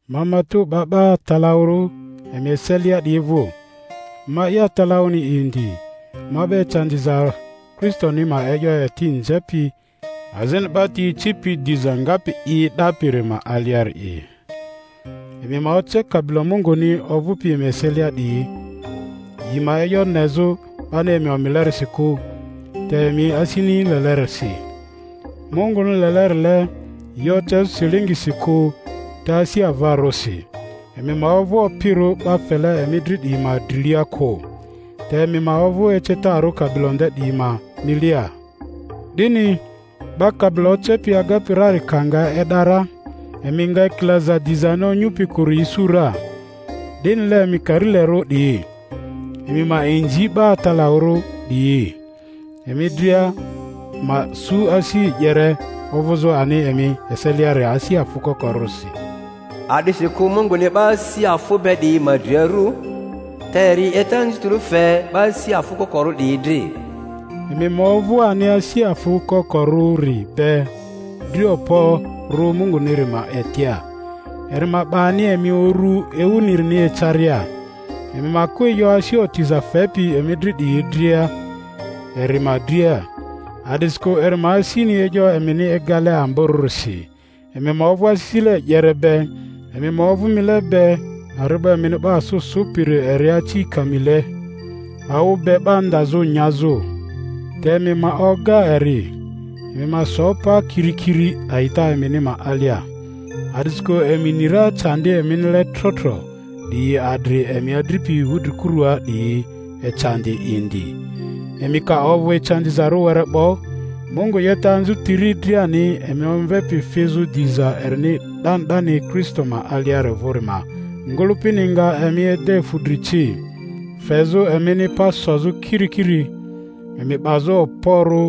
Ma matᴜ 'ba 'ba atalaᴜrᴜ emi eselia 'diyi vᴜ, ma'i atalaᴜni indi, ma 'ba ecandiza Kristoni ma e'yo eti nzepi, azini 'ba ti ecipi diza ngapi i e'dapiri ma aliari'i. Emi ma oce kabilo Munguni ovᴜpi emi eselia 'diyi, yi ma e'yo nezᴜ, 'bani emi omilerisi kᴜ te emi asini lelerisi, Munguni lelerile; yi ocezᴜ silingisi kᴜ te asi avarᴜsi; emi ma ovᴜ opirᴜ 'ba fele emi dri 'diyi ma drilia kᴜ, te emi ma ovᴜ ecetarᴜ kabilo nde 'diyi ma milia. 'Dini, 'Ba kabilo Ocepi agapi rari ka nga e'da ra, emi nga ekilaza dizani onyupi kᴜri isu ra. 'Dinile, emi karilerᴜ 'diyi, emi ma inzi 'ba atalaᴜrᴜ 'diyi. Emi dria ma su asi e'yere, ovᴜzᴜ ani emi eselia asi afᴜ kokorᴜsi, a'disikᴜ Munguni 'ba asi afᴜ be 'diyi ma dri aru, te eri 'yeta anzutiri fe 'ba asi afᴜ kokorᴜ 'diyi dri. Emi ma ovᴜ ani asi afᴜ kokorᴜri be dri okporo Munguniri ma etia, eri ma 'ba ani emi uru ewunirini ecaria. Emi ma kᴜ e'yo asi otiza fepi emi dri 'diyi dria eri ma dria, a'disikᴜ eri ma asini e'yo emini egale amborᴜrisi. Emi ma ovᴜ asisile e'yere be, emi ma ovᴜ mile be. Ari'bo emini 'ba asᴜ sᴜpiri eri aci kamile, awᴜ be 'ba ndazᴜ nyazᴜ. Te emi ma oga eri, emi ma so pa kirikiri a'ita emini ma alia, a'disikᴜ emi ni ra candi eminile trotro 'diyi adri emi adripi wudrikurua 'diyi ecandi indi. Emi ka ovᴜ ecandizarᴜ were 'bo, Mungu 'yeta anzutiri driani, emi omvepi fizᴜ diza erini 'dani 'dani Kristo ma aliari vᴜri ma ngᴜlᴜpini nga emi ede fudri ci, fezᴜ emini pa sozᴜ kirikiri, emi 'bazᴜ okporᴜ.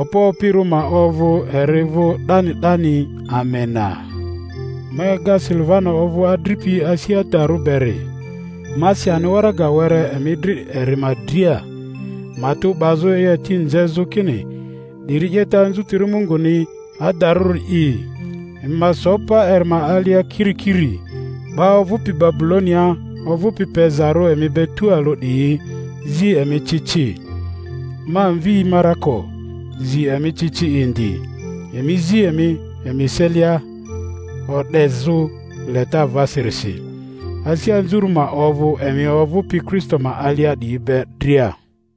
Okpo opirᴜ ma ovᴜ eri vᴜ 'dani 'dani. Amena. Ma ega Silivano ovᴜ adripi asi adarᴜ beri; ma si ani waraga were emi dri eri ma dria, matᴜ 'bazᴜ, e'yo eti nzezᴜ kini 'diri 'yeta anzutiri Munguni adarᴜri'i; emi ma so pa eri ma alia kirikiri. 'Ba ovᴜpi Babulonia ovᴜpi pezarᴜ emi be tualᴜ 'diyi zi emi ci ci; ma mvi Marako zi emi ci ci indi. Emi zi emi emi eselia o'dezᴜ leta avasirisi. Asi anzurᴜ ma ovᴜ emi ovᴜpi Kristo ma alia 'diyi be dria.